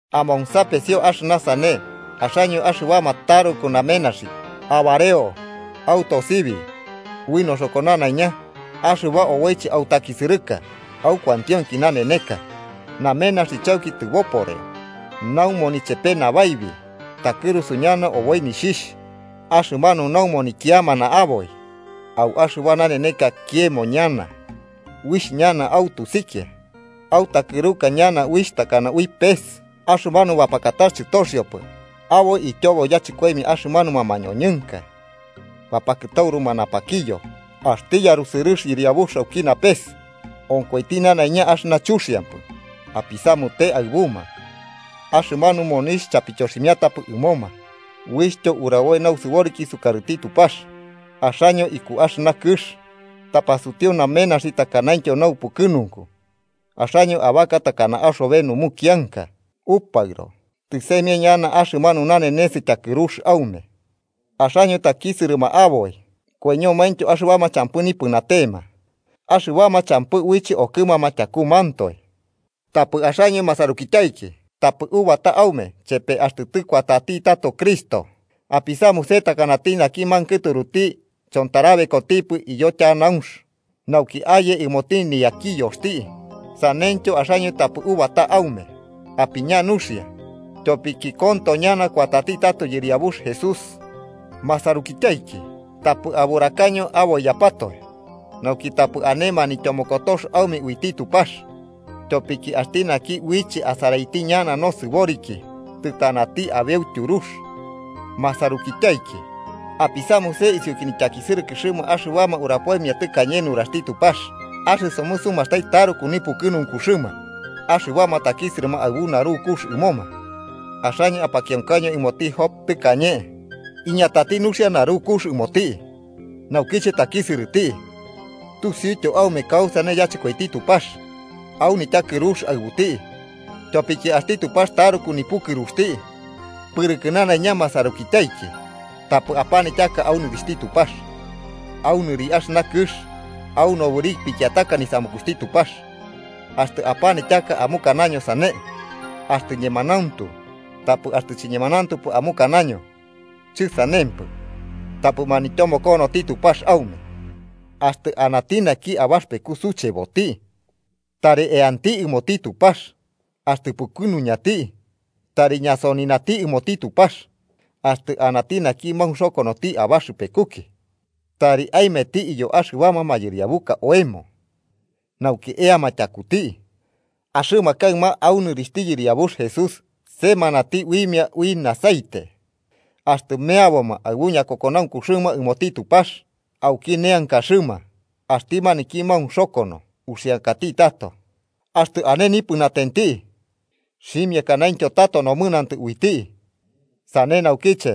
¡Amonsapesio axɨna sane, axaño axɨbama taruku namenaxi! ¡Abareo autosibi ui noxoko nanaiña axɨba oboiche autakisɨrɨka au kuantionki naneneka! Namenaxi chauki tɨboporeo. Naumoni chepe nabaibi takɨrusu ñana oboi nixhixh. Axɨmanu naumoni kiamana aboi au axɨba naneneka kiemo ñana, uixh ñana autusikia autakɨruka uixh ñana takana ui pes. Axɨmanu bapakatax chɨtoxiopɨ aboi ityobo yachɨkoimia axɨmanuma mañoñɨnka bapakɨtauruma napakiyo, axti yarusɨrɨx Yɨriabux auki napes onkoiti nanaiña axɨna chuxiampɨ apisamute aɨbuma. Axɨmanu monixh chapityoximiatapɨ ɨmoma uixhtyo uraboi nausɨboriki sukarɨti Tupax. Axaño iku axɨna kɨx tapasutiu namenaxi takanaintyo naupukɨnunku, axaño abaka takana axobe numukianka upaɨro, tɨsaimia ñana axɨmanu nanenes tyakɨrux aume. Axaño takisɨrɨma aboi koiñomaintyo axɨbama champɨ nipɨnatema, axɨbama champɨ uiche okɨmama tyakumantoe. Tapɨ axaño masarukityaiki, tapɨ ubata aume chepe axtɨ tɨkuatati tato Cristo. Apisamuse takanati naki mankɨturuti chontarabekotipɨ iyo tyanaunx nauki aye ɨmoti niyakiyoxti. Saneityo axaño tapɨ ubata aume apiña nuxia, tyopiki konto ñana kuatati tato Yɨriabux Jesús. Masarukityaiki, tapɨ aburakaño aboiyapatoe, nauki tapɨ ane manityomokotox aume uiti Tupax, tyopiki axti naki uiche asaraiti ñana nosɨboriki, tɨtanati abeu tyurux. Masarukityaiki, apisamuse isiuki nityakisɨrɨkɨxɨma axɨbama urapoimia tɨkañe nuraxti Tupax. Axɨsomɨ sumastai taruku nipukɨnunkuxɨma axɨbama takisɨrɨma aɨbu narukux ɨmoma. Axaño apakionkaño ɨmoti Job tɨkañe, iñatati nuxia narukux ɨmoti naukiche takisɨrɨti, tusiuityo aume kausane yachɨkoiti Tupax au nityakɨrux aɨbuti, tyopiki axti Tupax taruku nipukɨruxti. Pɨrɨkɨ nanaiña masarukityaiki, tapɨ apanityaka au nɨrixhti Tupax, au nɨri axɨna kɨx, au nobɨri pikiataka nisamukuxti Tupax. Axtɨ apanityaka amukanaño: “Sane”, axtɨ ñemanauntu. Tapɨ axtɨ chiñemanauntupɨ amukanaño: “chɨsanempɨ”, tapɨ manityomokonoti Tupax aume. Axtɨ anati naki abaxɨpeku sucheboti, tari eanti ɨmoti Tupax. Axtɨ pukɨnuñati, tari ñasoninati ɨmoti Tupax. Axtɨ anati naki maunxokonoti abaxɨpekuki, tari aemeti iyo axɨbama mayɨriabuka oemo nauki eama tyakuti, axɨma kaɨma au nɨrixhti Yɨriabux Jesús semanati uimia ui aceite. Axtɨ meaboma aɨbu ñakokonaunkuxɨma ɨmoti Tupax auki neankaxɨma, axti maniki maunxokono uxiankati tato, axtɨ ane nipɨnatenti, xhimiakanaintyo tato nomɨnantɨ uiti. Sane naukiche,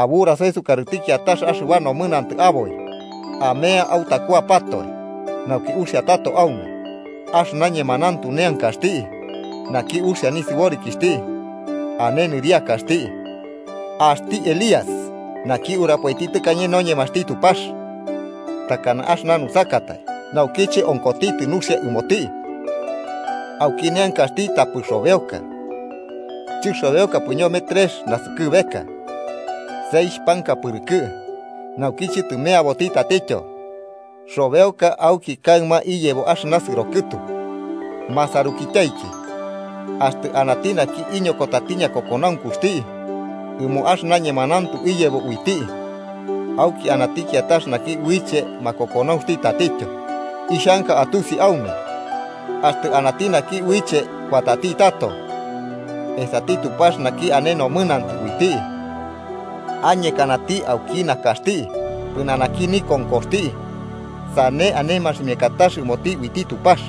aburasaño sukarɨti kiatax axɨba nomɨnantɨ aboi, amea autakuapatoe nauki uxia tato aume. Axɨna ñemanauntu neankaxti naki uxia nisɨborikixhti ane nɨriakax. Axti Elías, naki urapoiti tɨkane noñemaxti Tupax, takana axɨna nusakatai, naukiche onkotitɨ nuxia ɨmoti auki neankaxti tapɨ robeoka, chɨxobeokapɨ ñome trex naskɨbeka seixh panka pɨrɨkɨ. Naukiche tɨmeaboti tatityo, xobeoka auki kaɨma iyebo axɨna sɨro kɨtu. Masarukityaiki, axtɨ anati naki iñokotati ñakokonaunkuxti ɨmo axɨna ñemanauntu iyebo uiti, auki anati kiatax naki uiche makokonaunxti tatityo, ixhanka atusi aume axtɨ anati naki uiche kuatati tato esati Tupax naki ane nomɨnantɨ uiti, añekanati auki nakaxti pɨnanaki nikonkoxti sane ane maximiakatax ɨmoti uiti Tupax.